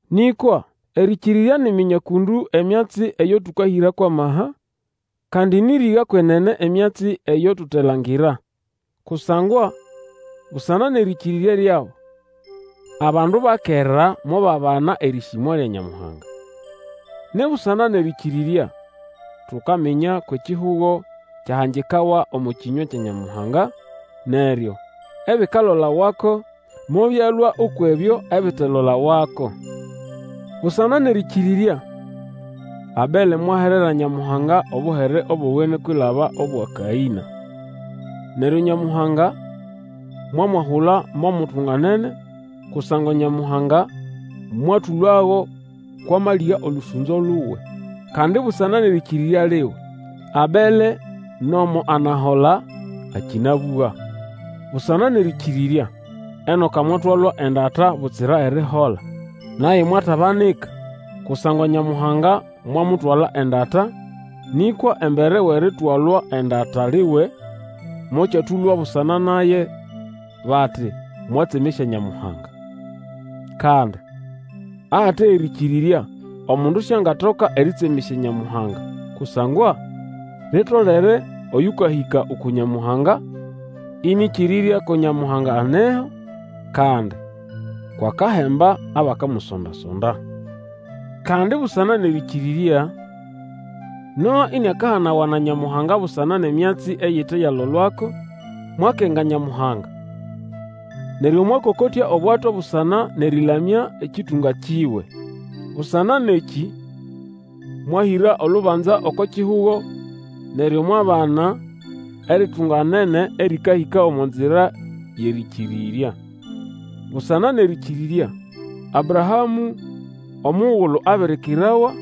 Nĩkwa erĩkĩrĩrya ni ʼminya kũndũ emyatsi eyo tũkahĩra kwʼamaha, kandi nĩʼriga kwenene emyatsi eyo tutelangira. Kusangwa busana nʼerĩkĩrĩrya lyabo, abandu ba kera mobabana erĩsĩmwa lya Nyamuhanga. Ni busana nʼerĩkĩrĩrya tukaminya kwʼekihugo kyahangikawa omo kĩnywa kya Nyamuhanga, neryo ebikalolawako mobyalũa ukwʼebyo ebitelolawako. Busana nʼerĩkĩrĩrya Abele mwaherera Nyamuhanga obuhere bowene kwilaba obwa Kaĩna. Neryo Nyamuhanga mwamwahula mo mutunganene kusangwa Nyamuhanga mwatũlago kwʼamalĩga olũsũnzo luwe. Kandi busana nʼerĩkĩrĩrya liwe, Abele nomo anahola, akĩnabũga. Busana nʼerĩkĩrĩrya, Enoka mwatwalwa endata butsira erihola, naye mwatabanika, kusangwa Nyamuhanga mwamutwala endata; nĩkwa embere wʼeritwalwa endata liwe, mokyatũlwa busana naye bati mwatsemesya Nyamuhanga. Kandi ahate erĩkĩrĩrya omundu siangatoka erĩtsemesya Nyamuhanga, kusangwa litolere oyũkahĩka uku Nyamuhanga ĩnĩkĩrĩrya ko Nyamuhanga aneho, kandi kwʼakahemba abakamusonda-sonda. Kandi busana nʼerĩkĩrĩrya, Noa iniakahanawa na Nyamuhanga busana nʼemyatsi eyite yalolwako, mwakenga Nyamuhanga; neryo mwakokotya obwato busana nʼerĩlamya ekĩtũnga kiwe. Busana nʼekĩ mwahĩra olubanza oko kihugo, neryo mwabana eritunganene erĩkahĩka omo nzira yʼerĩkĩrĩrya. Busana nʼerĩkĩrĩrya, Abrahamũ omugulu abirikirawa,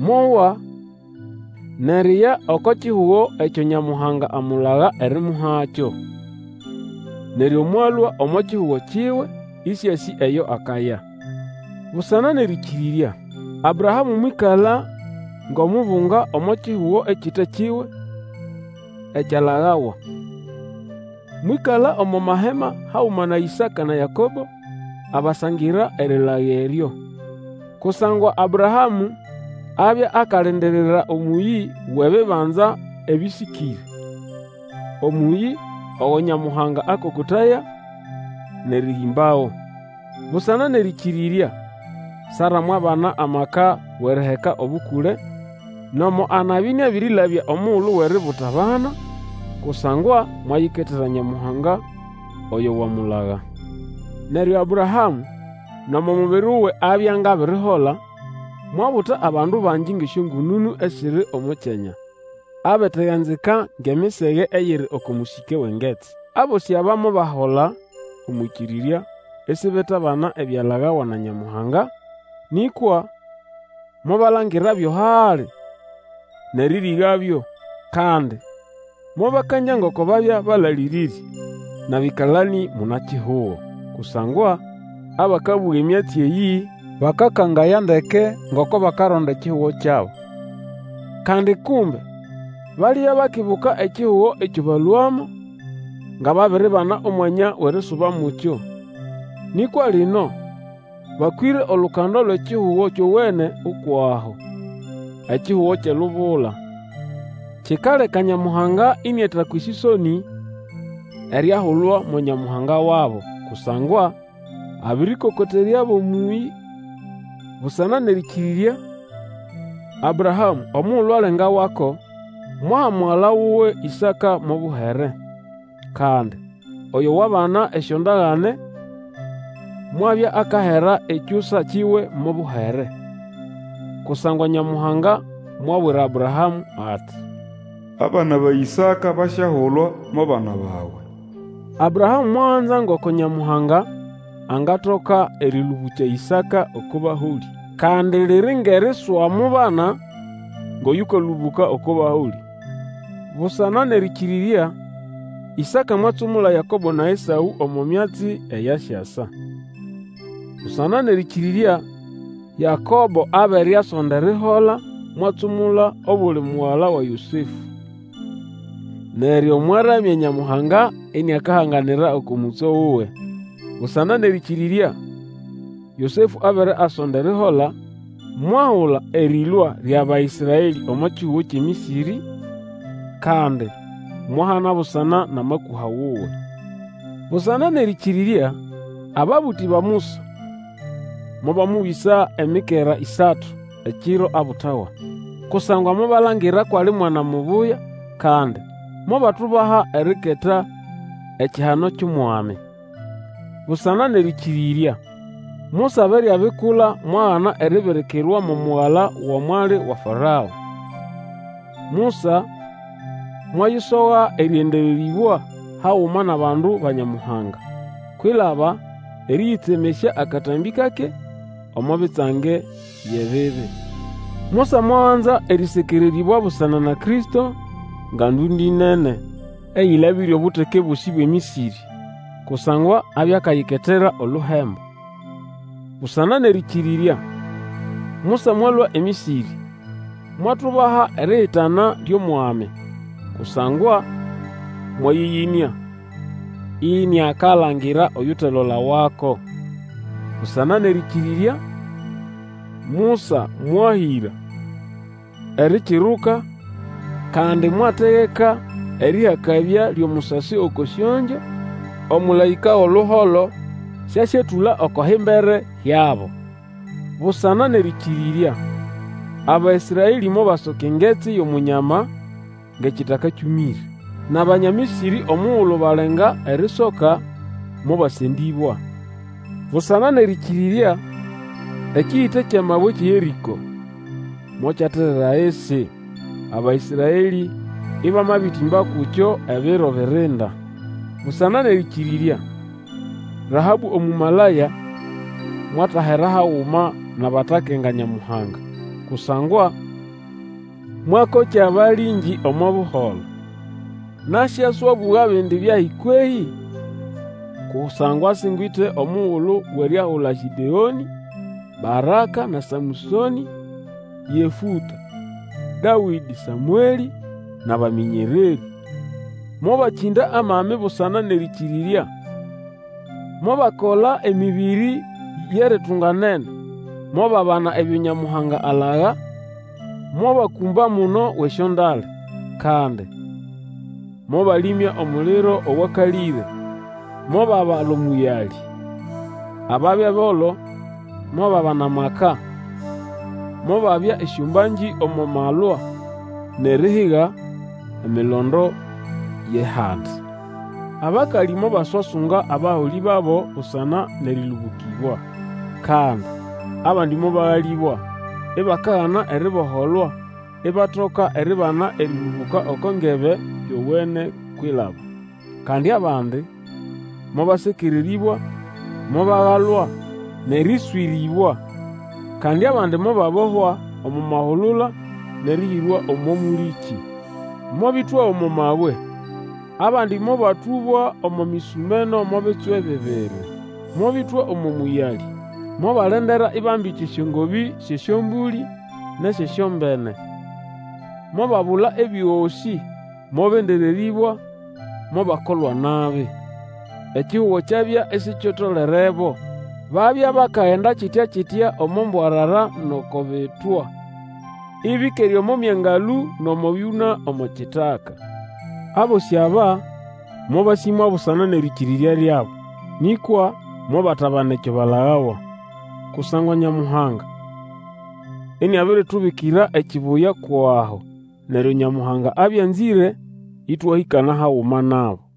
mwowa, nʼeriya oko kihugo ekyo Nyamuhanga amulaga erimuhakyo. Neryo mwalũa omo kihugo kiwe, ĩsĩasĩ eyo akaya. Busana nʼerĩkĩrĩrya, Abrahamũ mwĩkala ngʼomubunga omo kihugo ekite kiwe, ekyalagawa. Mwĩkala omo mahema haguma na Ĩsaka, na Yakobo, abasangira erilaga eryo. Kusangwa Abrahamũ abya akalindirira omũyĩ Wʼebibanza ebĩsĩkĩre. Omũyĩ ogo Nyamuhanga akokotaya nʼerĩhĩmbago. Busana nʼerĩkĩrĩrya, Sara mwabana amaka wʼeriheka obukule, nomo anabya ĩnĩabĩrĩlabya omugulu wʼeributa abana, kusangwa mwayiketera Nyamuhanga oyo wamulaga. Neryo Abrahamũ nomo mubiri wuwe abya ngʼabirihola, mwabuta abandu bangi ngʼesyongũnũnũ esiri omo kyanya, abateganzika ngʼemisege eyiri oko mũsĩke wʼengetsi. Abosĩ aba mobahola omwʼĩkĩrĩrya, isibetabana ebyalagawa na Nyamuhanga, nĩkwa mobalangirabyo hali, nʼerĩrĩgabyo, kandi mobakangya ngoko babya balalĩrĩrĩ, nʼabĩkalanĩ muna-kihugo. Kusangwa abakabũga emyatsi eyĩ, bakakangaya ndeke ngoko bakaronda ekihugo kyabo. Kandi kumbe balibya bakibuka ekihugo ekyo balũamo, nga babiribana omwanya wʼerisuba mukyo. Nĩkwa lino, bakwĩre olukando lwʼekihugo kyowene ukwʼaho, ekihugo kyʼelubula. Kikaleka Nyamuhanga ĩnĩatakwa esĩsonĩ eriahulwa mo Nyamuhanga wabo; kusangwa abĩrĩkokoteryabo omũyĩ. Busana nʼerĩkĩrĩrya, Abrahamũ omugulu alengawako, mwaha mugala wuwe Ĩsaka mo buhere. Kandi oyo wabana esyondagane, mwabya akahera ekyusa kiwe mo buhere. Kusangwa Nyamuhanga mwabwira Abrahamũ ati, Abana ba Ĩsaka basyahulwa mo bana bawe. Abrahamũ mwaganza ngoko Nyamuhanga angatoka erĩlũbũkya Ĩsaka oko baholĩ, kandi liri ngʼeriswamubana ngʼoyũkalũbũka oko baholĩ. Busana nʼerĩkĩrĩrya, Isaka mwatsumula Yakobo na Esaũ omo myatsi eyasyasa. Busana nʼerĩkĩrĩrya, Yakobo abere asonda erihola mwatsumula obuli mugala wa Yosefũ. Neryo mwaramya Nyamuhanga iniakahanganira oko mũtso wuwe. Busana nʼerĩkĩrĩrya, Yosefũ abere asonda erihola, mwahula erĩlũa lyʼAbaĩsraelĩ omo kihugo kyʼeMĩsĩrĩ, kandi mwahana busana nʼamakũha wuwe. Busana nʼerĩkĩrĩrya, ababũtĩ ba Musa mobamũbĩsa emikera ĩsatu, ekiro abutawa. Kusangwa mobalangira kwʼali mwana mubuya, kandi mobatubaha eriketa ekihano kyʼOmwami. Busana nʼerĩkĩrĩrya, Musa abere abikula mwagana eribirikirwa mo mugala wa mwali wa Farao. Musa mwayisoga erĩendererĩbwa haguma nʼabandu ba Nyamuhanga, kwilaba erĩyĩtsemesya akatambĩ kake omo bitsange byʼebibi. Musa mwaganza erĩsekererĩbwa busana na Kristo nga ndũndĩ nene eyĩlabĩre obuteke bosĩ bwʼeMĩsĩrĩ, kusangwa abya akayiketera oluhembo. Busana nʼerĩkĩrĩrya Musa mwalũa eMĩsĩrĩ, mwatubaha erihitana lyʼOmwami. Kusangwa mwayĩyĩnĩa, iniakalangira oyutelolawako. Busana nʼerĩkĩrĩrya, Musa mwahĩra Erikiruka, kandi mwategeka erĩhakabya lyʼomusasi oko syongyo, omũlaĩka wʼoluholo siasyetũla oko himbere hyabo. Busana nʼerĩkĩrĩrya, Abaĩsraelĩ mobasoka Engetsi yʼOmunyama ngʼekitaka kyũmĩre, nʼAbanya Mĩsĩrĩ omugulu balenga erisoka, mobasendĩbwa. Busana nʼerĩkĩrĩrya, ekĩyĩte kyʼamabwe ekyʼeYerĩko mokyaterera ahisi, Abaĩsraelĩ ĩbamabĩtĩmba kukyo ebiro birinda. Busana nʼerĩkĩrĩrya, Rahabũ Omũmalaya mwatahera haguma nʼabatakenga Nyamuhanga, kusangwa mwakokya abalĩngĩ omo buholo. Nasyaswabũga bindi byahi kwehĩ? Kusangwa singwite omugulu wʼeryahula Gĩdeonĩ, Baraka, na Samũsonĩ, Yefũta, Dawĩdĩ, Samwelĩ nʼabamĩnyererĩ; mobakĩnda amami busana nʼerĩkĩrĩrya, mobakola emĩbĩrĩ yʼeritunganene, mobabana ebyo Nyamuhanga alaga, mba amuno wʼesyondale. Kandi mobalĩmya omuliro owakalĩre, mobabala omũyalĩ. Ababya bolo mobabana amaka, mobabya esyombangĩ omo malwa, nʼerihiga emilondo yʼehandi. Abakalĩ mobaswasunga abaholĩ babo busana nʼerĩlũbũkĩbwa. Kandi abandi mobagalĩbwa, ibakagana eriboholwa, ibatoka eribana erĩlũbũka oko ngebe yowene kwilaba. Kandi abandi mobasekererĩbwa, mobagalwa, nʼerĩswĩrĩbwa, kandi abandi mobabohwa omo mahulula nʼerĩhĩrwa omo mũlĩkĩ. Mobĩtwa omo mabwe, abandi mobatũbwa omo mĩsũmeno mo bitswe bibiri, mobĩtwa omo mũyalĩ, mobalendera ibambite esyongobĩ syʼesyombũlĩ nʼesyʼesyombene, mobabula ebyosĩ, mobendererĩbwa, mobakolwa nabi. Ekihugo kyabya isikitolerebo. Babya bakagenda kitya-kitya omo mbwarara nʼoko bitwa, ĩbĩkere omo myangalũ, nʼomo byũna omo kitaka. Abosĩ aba mobasĩmwa busana nʼerĩkĩrĩrya lyabo, nĩkwa mobatabana ekyo balagawa. Kusangwa Nyamuhanga iniabiritubikira ekibuya kwʼaho, neryo Nyamuhanga abya anzĩre ĩtwahĩkana haguma nabo.